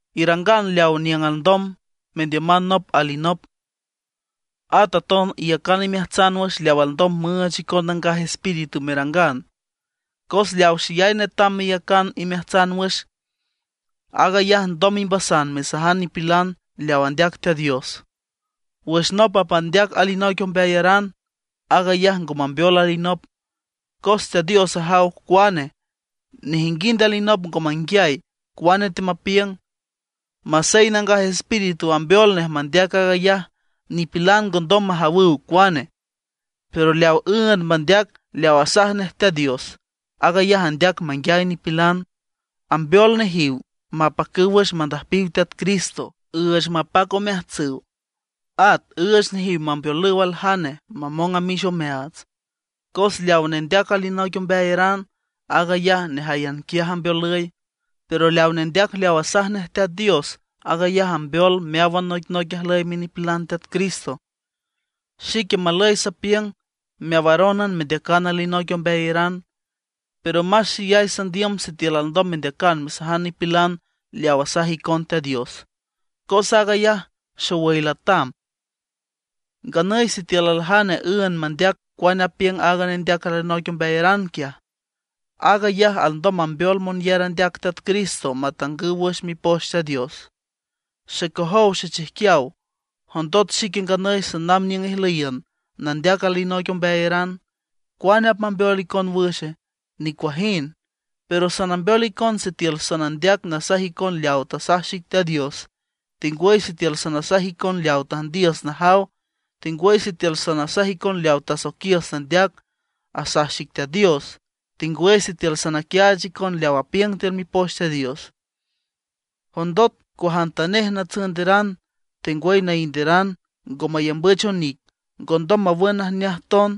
Irangan leaw niüng alndom mendiüman nop alinop. At aton iyacan imeajtsan wüx leaw alndom müüch icon Nangaj Espíritu merangan. Cos leaw xeyay netam meyacan imeajtsan wüx, aag ayaj ndom imbasan mesajan nipilan leaw andeac Teat Dios. Wüx nop apmandeac alinoic ombeayaran, aag ayaj ngo mambeol alinop, cos Teat Dios ajaw cuane; nejinguind alinop ngo manguiay cuane teamapiüng. Masey Nangaj Espíritu ambeol nej mandeac aag ayaj, nipilan ngondom majawüw cuane. Pero leaw üünd mandeac leaw asaj nej Teat Dios, aag ayaj andeac manguiay nipilan, ambeol nejiw mapacüw wüx mandüjpiw Teat Cristo, üüch mapac omeajtsüw, at üüch nejiw mambeolüw aljane mamong amix omeaats. Cos leawa nendeac alinoic ombeayaran, aag ayaj nejáyan quiaj ambeolüy. Pero leaw nendeac leaw asaj nej Teat Dios, aag ayaj ambeol meáwan noicnoic ajlüy minipilan Teat Cristo. Xique malüy sapiüng meawarónan mendeacan alinoic ombeayaran, pero más xeyay sandiüm sitiül alndom mendeacan mesajan nipilan leaw asaj icon Teat Dios, cos aag ayaj xowüy latam. Nganüy sitiül aljane üünd mandeac cuane apiüng aaga nendeac alinoic ombeayaran quiaj, aag ayaj alndom mambeol monyar andeac Teat Cristo matangüw wüx Mipoch Teat Dios. Xecojow xechijquiaw, jondot xique nganüy sanamb niüng ijlüyiün nandeac alinoic ombeayaran, ¿cuane apmambeol icon wüx? ¡Nicuajind! Pero sanambeol icon sitiül sanandeac nasaj icon leaw tasaj xic Teat Dios, tengwüy sitiül sanasaj icon leaw tüjndiüs najaw, tengwüy sitiül sanasaj icon leaw tasoiquiüs nandeac, asaj xic Teat Dios, tengwüy sitiül sanaquiaach icon leaw apiüng tiül Mipoch Teat Dios. Jondot cuajantanej natsünderan tengwüy nainderan ngo mayambüch onic, ngondom mawün najneaj ton.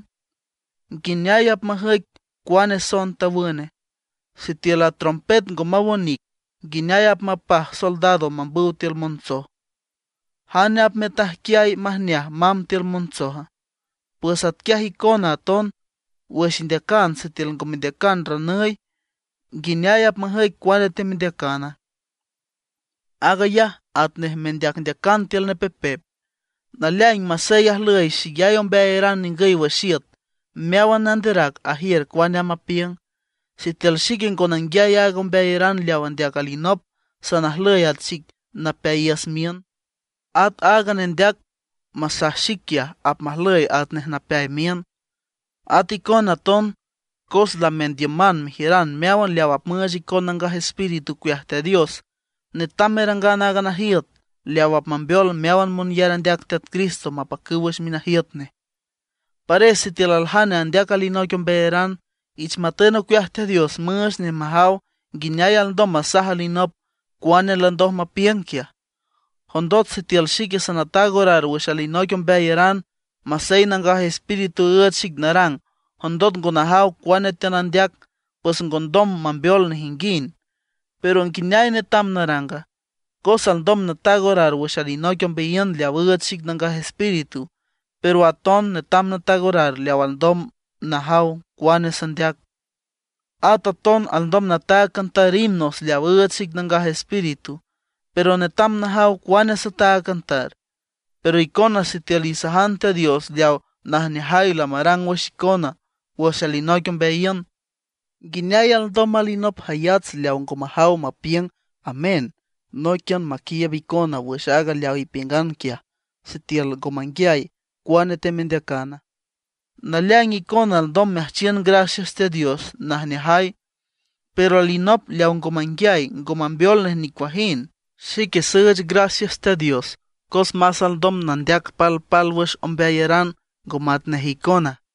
¿Nguineay apmajüic cuane soen tawüne? Sitiül a trompet ngo maw onic, nguineay apmapaj soldados mambüw tiül montsoj. ¿Jane apmetajquiay majneaj mamb tiül montsoja? Pues atquiay icona aton wüx indeacan sitiül ngo mendeacan ranüy, ¿nguineay apmajüic cuane teamendeacana? Aag ayaj atnej mendeacndeacan tiül nepepep. Naleaing, masey ajlüy xeyay ombeayaran ningüy wüx iüt, meáwan nanderac ajiür cuane amb apiüng. Sitiül xique ngo nanguiay aaga ombeayaran leaw andeac alinop, sanajlüy at xic napeayiüs miün; at aaga nendeac masaj xic quiaj, apmajlüy atnej napeay miün. At icona aton cos lamendiüman mejiüran meáwan leaw apmüüch icon Nangaj Espíritu ocueaj Teat Dios, netam merangan aaga najiüt leaw apmambeol meáwan monyar andeac Teat Cristo mapacüw wüx minajiüt nej. Pares sitiül aljane andeac alinoic ombeayaran, ich matün ocueaj Teat Dios müüch nej majaw nguineay alndom masaj alinop cuane landoj mapiüng quiaj. Jondot sitiül xique sanataag orar wüx alinoic ombeayaran, masey Nangaj Espíritu üüch xic narang, jondot ngo najaw cuane teanandeac, pues ngondom mambeol nejinguind. Pero, ¿nguineay netam naranga? Cos alndom nataag orar wüx alinoic ombeayiün leaw üüch xic Nangaj Espíritu, pero aton netam nataag orar leaw alndom najaw cuane sandeac. At aton alndom nataag cantar himnos leaw üüch xic Nangaj Espíritu, pero netam najaw cuane sataag cantar. Pero icona sitiül isajan Teat Dios leaw najneajay lamarang wüx icona wüx alinoic ombeayiün, ¿nguineay alndom alinop jayats leaw ngo majaw mapiüng “amén” nóiquian maquiiüb icona wüx aag leaw ipiüngan quiaja, sitiül ngo manguiay cuane temendeacana? Naleaing icona alndom meajchiün gracias Teat Dios najneajay, pero alinop leaw ngo manguiay ngo mambeol nej nicuajind. Xique süüch gracias Teat Dios cos más alndom nandeac palpálwüx ombeayaran ngo matnej icona.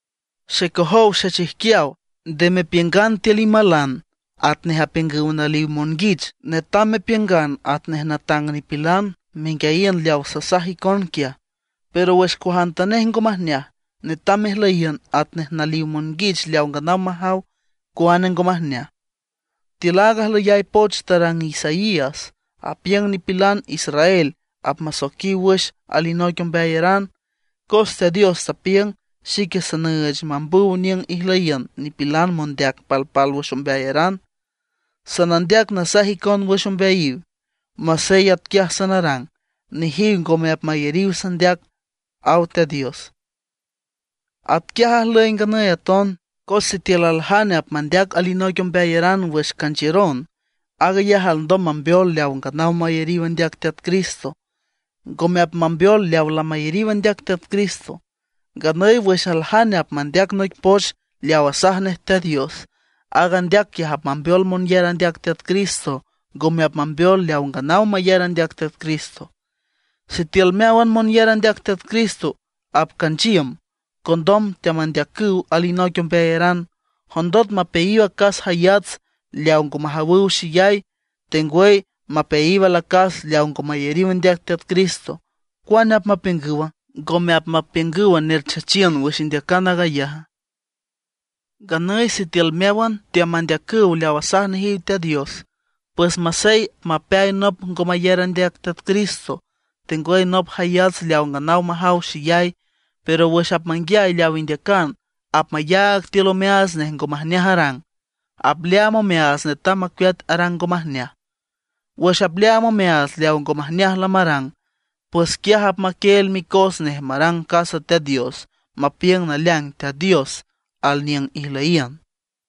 Xecojow xechijquiaw, nde mepiüngan tiül imalan atnej apiüngüw naliw monguich. Netam mepiüngan atnej natang nipilan, menguiayiün leaw sasaj icon quiaj. Pero wüx cuajantanej ngo majneaj, netam mejlüyiün atnej naliw monguich leaw nganaw majaw cuane ngo majneaj. Tiül aaga ajlüyay poch tarang Isaías apiüng nipilan israel apmasoiquiw wüx alinoic ombeayaran, cos Teat Dios tapiüng: “Xique sanüüch mambüw niüng ijlüyiün nipilan mondeac palpálwüx ombeayaran. Sanandeac nasaj icon wüx ombeayiw. Masey atquiaj sanarang, nejiw ngome apmayariw sandeac”, aw Teat Dios. Atquiaj ajlüy nganüy aton, cos sitiül aljane apmandeac alinoic ombeayaran wüx canchiüron, aag ayaj alndom mambeol leaw nganaw mayariw andeac Teat Cristo, ngome apmambeol leaw lamayariw andeac Teat Cristo. Nganüy wüx aljane apmandeac noic poch leaw asaj nej Teat Dios, aaga andeac quiaj apmambeol monyar andeac Teat Cristo, ngome apmambeol leaw nganaw mayar andeac Teat Cristo. Sitiül meáwan monyar andeac Teat Cristo apcanchiüm, condom teamandeacüw alinoic ombeayaran, jondot mapeayiw acas jayats leaw ngo majawüw xeyay, tengwüy mapeayiw alacas leaw ngo mayariw andeac Teat Cristo, ¿cuane apmapiüngüwa? ¿Ngome apmapiüngüw nerchachiün wüx indeacan aag ayaja? Nganüy sitiül meáwan teamandeacüw leaw asaj nejiw Teat Dios, pues masey apmapeay nop ngo mayar andeac Teat Cristo, tengwüy nop jayats leaw nganaw majaw xeyay, pero wüx apmanguiay leaw indeacan, apmayaag tiül omeaats nej ngo majneaj arang, apleaam omeaats netam macueat arang ngo majneaj. Wüx apleaam omeaats leaw ngo majneaj lamarang, pues quiaj apmaquieel micos nej marang casa Teat Dios, mapiüng naleaing Teat Dios alniüng ijlüyiün.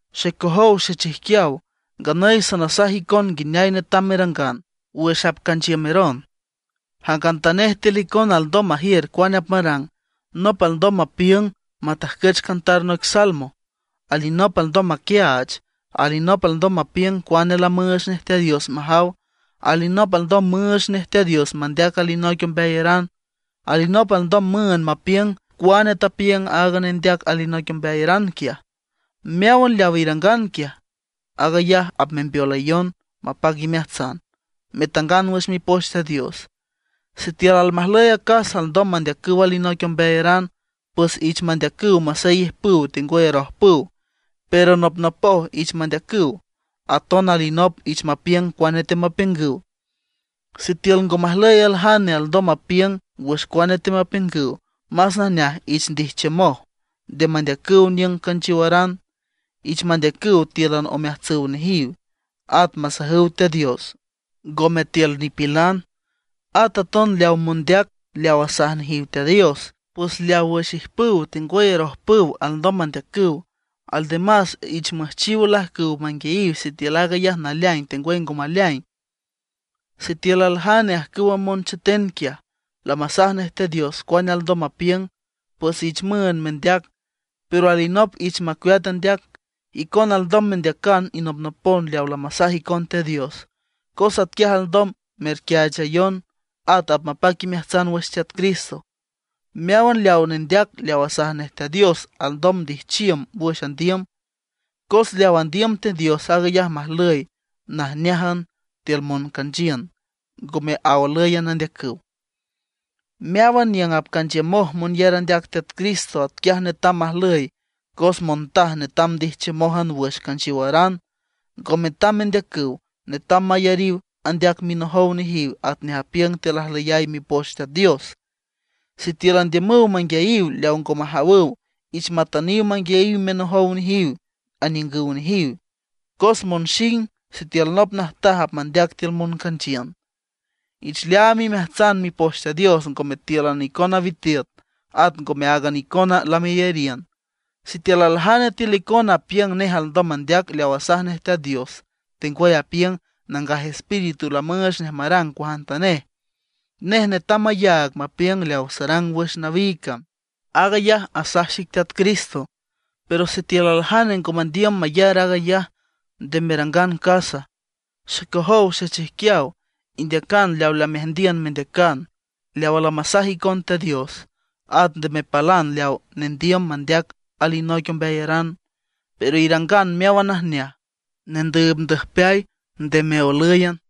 Xecojow xechijquiaw, nganüy sanasaj icon nguineay netam merangan. Wüx apcanchiümeron, jangantanej tiül icona alndom majiür cuane apmarang. Nop alndom mapiüng matajcüch cantar noic salmo, alinop alndom maquiaach, alinop alndom mapiüng cuane lamüüch nej Teat Dios majaw, alinop alndom müüch nej Teat Dios mandeac alinoic ombeayaran, alinop alndom müünd mapiüng cuane tapiüng aaga nendeac alinoic ombeayaran quiaj. Meáwan leaw irangan quiaj, aag ayaj apmembeolayon mapac imeajtsan, metangan wüx Mipoch Teat Dios. Sitiül almajlüy acas alndom mandeacüw alinoic ombeayaran, pues ich mandeacüw masey ijpüw tengwüy arojpüw, pero nopnopoj ich mandeacüw; aton alinop ich mapiüng cuane teamapiüngüw. Sitiül ngo majlüy aljane alndom mapiüng wüx cuane teamapiüngüw, más najneaj ich ndijchiümoj, nde mandeacüw niüng canchiowaran. Ich mandeacüw tíülan omeajtsüw nejiw, at masajüw Teat Dios, ngome tiül nipilan. At aton leaw mondeac leaw asaj nejiw Teat Dios, pues leaw wüx ijpüw tengwüy arojpüw alndom mandeacüw. Aldemas ich müjchiw olajcüw manguiayiw sitiül aag ayaj naleaing tengwüy ngo maleaing. Sitiül aljane ajcüwa moncheten quiaj, lamasaj nej Teat Dios cuane alndom mapiüng, pues ich müünd mendeac; pero alinop ich macueat andeac. Icona alndom mendeacan inopnopon leaw lamasaj icon Teat Dios, cos atquiaj alndom merquiaachayon, at apmapac imeajtsan wüx Teat Cristo. Meáwan leaw nendeac leaw asaj nej Teat Dios alndom ndijchiüm wüx andiüm. Cos leaw andiüm Teat Dios aag ayaj majlüy najneájan tiül moncanchiün, ngome aolǘyan andeacüw. Meáwan niüng apcanchiümoj monyar andeac Teat Cristo, atquiaj netam majlüy. Cos montaj netam ndijchiümójan wüx canchiowaran; ngo metam mendeacüw, netam mayariw andeac minojow nejiw atnej apiüng tiül ajlüyay Mipoch Teat Dios. Sitiül andiümüw manguiayiw leaw ngo majawüw, ich matüniw manguiayiw minojow nejiw aniüngüw nejiw, cos monxing sitiül nop najtaj apmandeac tiül moncanchiün. Ich leaam imeajtsan Mipoch Teat Dios ngome tíülan icona witiüt, at ngome áagan icona lameyariün. Sitiül aljane tiül icona apiüng nej alndom mandeac leaw asaj nej Teat Dios, tengwüy apiüng Nangaj Espíritu lamüüch nej marang cuajantanej, nej netam mayaag mapiüng leaw sarang wüx nawiig cam, aag ayaj asaj xic Teat Cristo. Pero sitiül aljane ngo mandiüm mayar aag ayaj, nde merangan casa. Xecojow xechijquiaw, indeacan leaw lameajndiün mendeacan, leawa lamasaj icon Teat Dios; at nde mepalan leaw nendiüm mandeac alinoic ombeayaran. Pero irangan meáwan najneaj, nendüübndüjpeay, nde meolǘyan.